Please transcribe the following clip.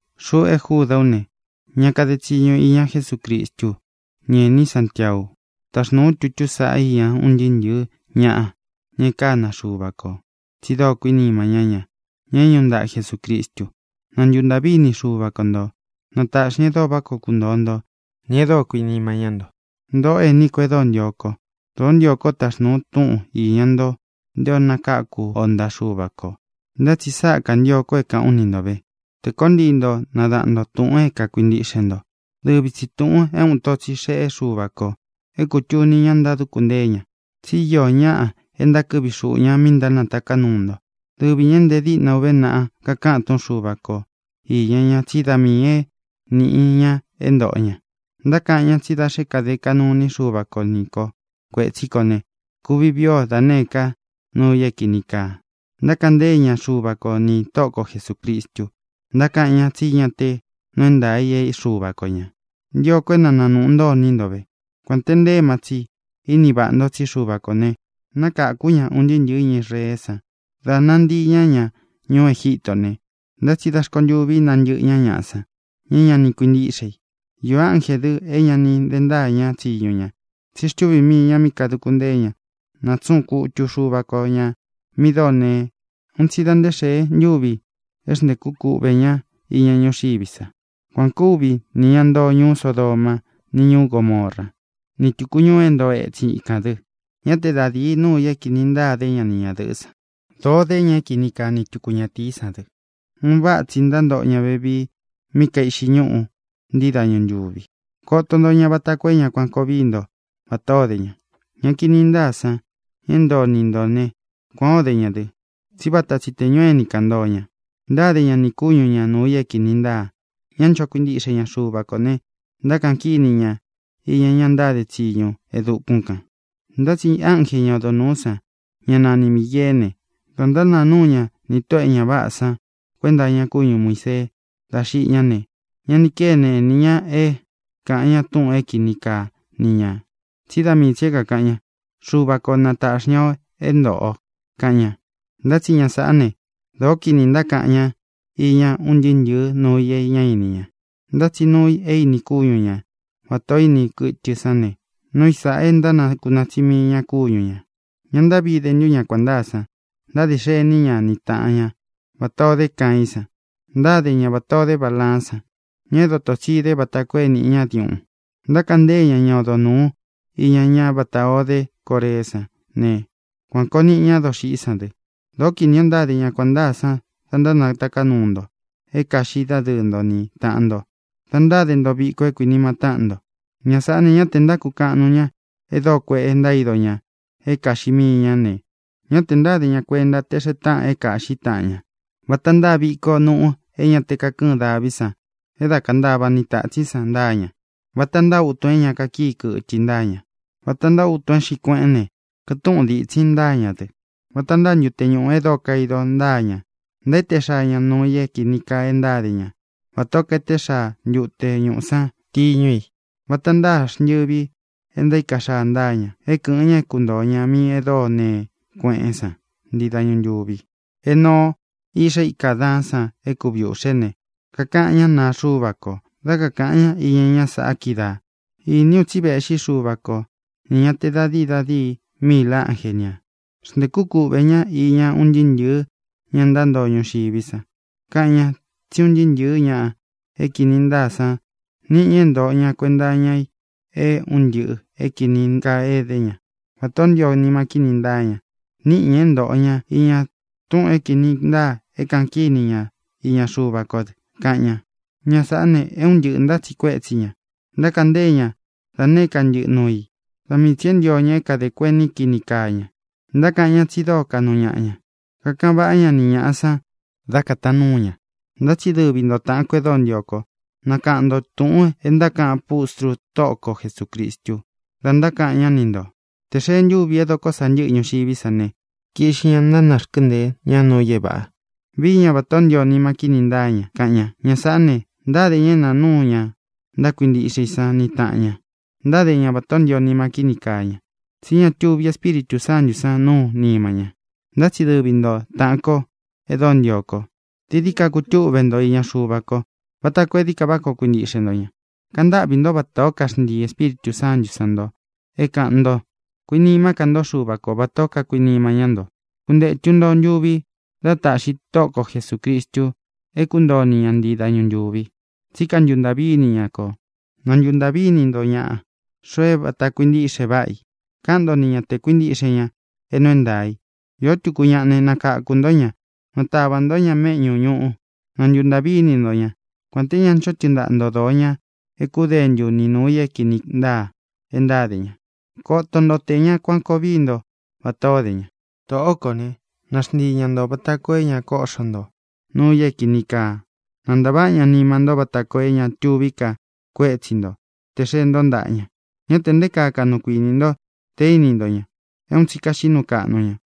Xuꞌu e Júdā ú ne, ña kade tsiñu iña Jesúcristú u, ni ēní Santiaú u. Taxnūu ú tutú saꞌa iña un ntɨɨ́ ntɨ̄ɨ́ ñaꞌa, ña e kána Xuva kō tsi dóo kuínima ñá ña, ña é ñūꞌu ntaꞌa Jesucristu. Na ntuntāꞌví ini Xuva ko ntō. Na tāꞌxi ña e dóo vaꞌá koo kuntoo nto nī e dóo kuinima ñá nto. Ntōꞌó ení ko e dóo ntio kó, dōó ntio kó taxnūu u túꞌun īña nto nté ō nakáku o ntaꞌa Xuva kō. Ntá tsi sáꞌa kantio ko é kāꞌán u ni nto ve, tē koó ntii nto nadaꞌan ntō túꞌūn e kuíntiꞌxe nto, dɨvi tsi tūꞌun é uun ito tsi xéꞌe Xuva kō é kūtuni ña ntáduku ntée ña. Tsi íō ñáꞌa e ntákɨꞌvi xuꞌu ña mi ntánataká nuu ntó, dɨvi ñā é nte díꞌna uve naꞌa kakáꞌan túꞌun Xuva ko īña ña tsí da miī é nīꞌi ña é ntōꞌo ña. Ntákaꞌan ña tsí da xé kade kaꞌnu iní Xuva ko ni ko kuētsí kō ne, kuvi vii o da nēé ka nuu i é kīni kaa. Ntákaꞌan ntée ña Xuva ko nī Tóꞌo ko Jesūcristu, ntákaꞌan ña tsí ña te nuu é ntaā i é Xuva ko ñā. Ntio ko é na nānuꞌu ntó iní nto ve, kuān te nte éma tsi ini váꞌa nto tsí Xuva kō ne, nákākú ña un ntɨɨ́ ntɨ̄ɨ́ ña Israeé san dā nantii ña ña ñuú Egitó ne, ntá tsi da rkontûví nantɨ́ꞌɨ ña ñaꞌa san, ña é ña ni kuintíꞌxe i. Īo ánjē dɨ é ña ni de ntáa ña tsiñu ña, tsí xtuvī mii ña mí kāduku ntée ña. Nátsuꞌun kutu Xuva ko ñā mi dóo nee un tsi da nté xee ntúvi é xntēkú kuꞌvē ñá iña ñúxiví sa. Kuan ō kúvi nī ña ntoo ñuú Sodomá, ni ñūú Gomorá, ni tūku ñuu é ntoo etsin íkān dɨ. Ñá te da dīi nuu i é kīni ntaa de ñá ni ñadɨ̄ꞌɨ́ san. Dōo dé ña é kini kaa ni tuku ñatīí san dɨ. Un váꞌa tsi ntántoꞌo ña ve mí kaiꞌxi ñúꞌu ntii dañu ntūvi. Koto nto ña vata koo é ña kuan koo víi nto vatā o dé ña. Ña kini ntáa san, ña é ntoo niꞌi ntō né, kuān ó de ña dɨ, tsí vata tsi tē ñuu éni kān ntoo ña, ntáde ña nī kúñu ñā nuu i é kīni ntáa. Ña ncho kuintiꞌxe ña Xuva kō ne, ntákaꞌan kíni ña iña ña ntáde tsiñu e dukún kān. Ntá tsi ánje, ña odo nūú san, ñá nani Mīgeé ne, dā ntánāa núu ña nī tóꞌō e ña váꞌā san kuenta iña kúñu Muīsee dá xiꞌi ñá ne, ñá ni kene inī ña é kāꞌan ña túꞌūn é kini kaa ni ñā, tsí da mii tsī é kākaꞌan ña: “Xuva ko na tāꞌxi ña o é ntōꞌo o”, kaꞌan ña. Ntá tsi ña sāꞌá ne, dōó kinī ntákaꞌan ña iña un ntɨɨ́ ntɨ̄ɨ́ nuu i é ña íni ña. Ntá tsi nuu i é īni kúñu ña, vatā ó ini kɨtɨ sán ne, núu i sāꞌa e ntánakunaa tsí mii ñā kúñu ñā. ¡Ña ntáꞌvi de ntu ña kuān ntáa san! Ntáde xení ña ni tāꞌan ñá vatā o dé Caiín san. Ntáde ña vatā o dé Balaán san, ña é doto tsi īde vata koo é nīꞌi ñá diuꞌun. Ntákaꞌan ntée ña ña odo nūú iña ñá vatā o dé Coreé san ne, kuān koo niꞌi ñá doxiꞌí san dɨ. Dōó kinī o ntáde ña kuān ntáa san da ntánataká nuu nto é kāꞌxí dadɨɨ́ nto ni tāꞌan nto da ntáde nto viko é kuinima táꞌan kō. Ña sāꞌá ne, ña te ntákukaꞌan nuu ña e dóo kuēꞌe ntaído ña é kāꞌxi mii ña ne, ña te ntáde ña kuenta te xee táꞌan é kāꞌxí taꞌan ña. Vata ntáa viko nuꞌu é ña te kakɨ́ɨn daví san, e dá kantavá ni tātsín san, ntáa ña. Vata ntáa utun é ña kakíi kɨtɨ i ntáa ña. Vata ntáa utun é xiꞌí kueꞌen ne, kɨtúꞌun dítsin i ntáa ña dɨ. Vata ntáa ntute ñūꞌu e dóo kaido ntáa ña. Ntaéte xaa ña nuu i é kīni kaa e ntáde ña vatā ó kaeté xaa ntute ñuꞌu san tiñu i. Vata ntáa xntɨvi e ntaíka xaa ntáa ña, é kɨ̄ꞌɨn ña é kuntōo ña mí e dóo nee kueꞌén san ntii dañu ntūvi. Enoo, iꞌxá ika Ādaán san é kuvi ūꞌxe ne, kakaꞌan ñá naa Xuva ko dá kākaꞌan ña iña ñá saꞌa kídaā: “Iní u tsi véꞌxi Xuva ko, nī ñá te da dīi da díi míil ánje ñā. Xntēkú kuꞌvē ñá iña un ntɨɨ́ ntɨ̄ɨ́ ña ntántoo ñuxiví sa. Kaꞌan ña tsí un ntɨɨ́ ntɨ̄ɨ́ ña é kīni ntáa san niꞌi ña é ntōꞌo ña kuenta iña i é un ntɨꞌɨ̄ é kīni kaa é edé ña, vatā ó ntio nima kíni ntáa ña. Níꞌi ñā é ntōꞌo ña iña túꞌūn é kīni ntáa é kaꞌan kíni ña iña Xuva kó dɨ”, kaꞌan ña. Ña sāꞌá ne, é un ntɨꞌɨ̄ ntátsiꞌi kuétsi ña. Ntákaꞌan ntée ña da nēé ka ntɨꞌɨ nuu i. Da mii tsī é ntio ña é kāde kueni kini káa ña. Ntákaꞌan ñá tsi dóo kaꞌnu ñaꞌa ña. Kakaꞌan vaꞌá ña ni ñāꞌa san dá kataan nuu ña. Ntá tsi dɨvi nto, tāꞌan kó e dóo ntio kó, nakaꞌan nto tūꞌun e ntákaꞌan pústru Tóꞌo ko Jesūcristu da ntákaꞌan ñá ni ntō: “Tē xee ntúvi é doko sa ntɨ́ꞌɨ ñuxiví sa ne, kiꞌxi ña ntánarkɨ́nteē ñá nuu i é vāꞌa. Vií ña vatā ó ntio nima kíni ntáa ña”, kaꞌan ña. Ña sāꞌá ne, ntáde ña é nāa núu ña ntákuintiꞌxe i san ni tāꞌan ña. Ntáde ña vatā ó ntio nima kíni kaa ña, tsí ña tuvi Espíritū Sántū san nuú nima ña. Ntá tsi dɨvi nto, táꞌān ko e dóo ntio ko, dií dií ka kutúꞌve nto iña Xuva ko vata koo é dií ka vá koo kuintíꞌxe nto ña. Kantáꞌvī ntó vatā ó kaxntii Ēspíritū Sántū san nto é kāꞌan nto. Kuinimá ka nto Xuva ko vatā ó kakuinima ñá nto. Kuntetu nto ntuvi dá taꞌxi Tóꞌo ko Jesūcristu é kuntoo o ni ña ntii dañu ntūvi, tsí kantuntāꞌví ini ña kō. Na ntu ntāꞌví ini nto ñaꞌa, xoo é vāta kuintiꞌxe váꞌa i. Káꞌan nto ni ña te kuīntiꞌxe ña é nuu é ntaā i. Īó tuku ñaꞌa ne, nakākú nto ña, natavā ntó ña méꞌñū ñuꞌu. Na ntuntāꞌví ini nto ña, kuān té nte ña ncho tɨɨn ntáꞌa nto dōo ña é kudentu ni nūu i é kīni ntáa e ntáde ña. Koto nto tē ña kuan koo víi nto vatā ó de ña. Tōꞌó kō né, na xntii ña ntō vata koo é ña kóꞌxo nto nuu i é kīni kaa. Na ntāváꞌa ña nima ntó vata koo é ña tuví ka kuétsi nto tē xee ntó ntaꞌa ña. Ñá tē nté kaa kaꞌnu kuinī nto te íni nto ña, é un tsi kaxiꞌí nuu kaꞌnu ña.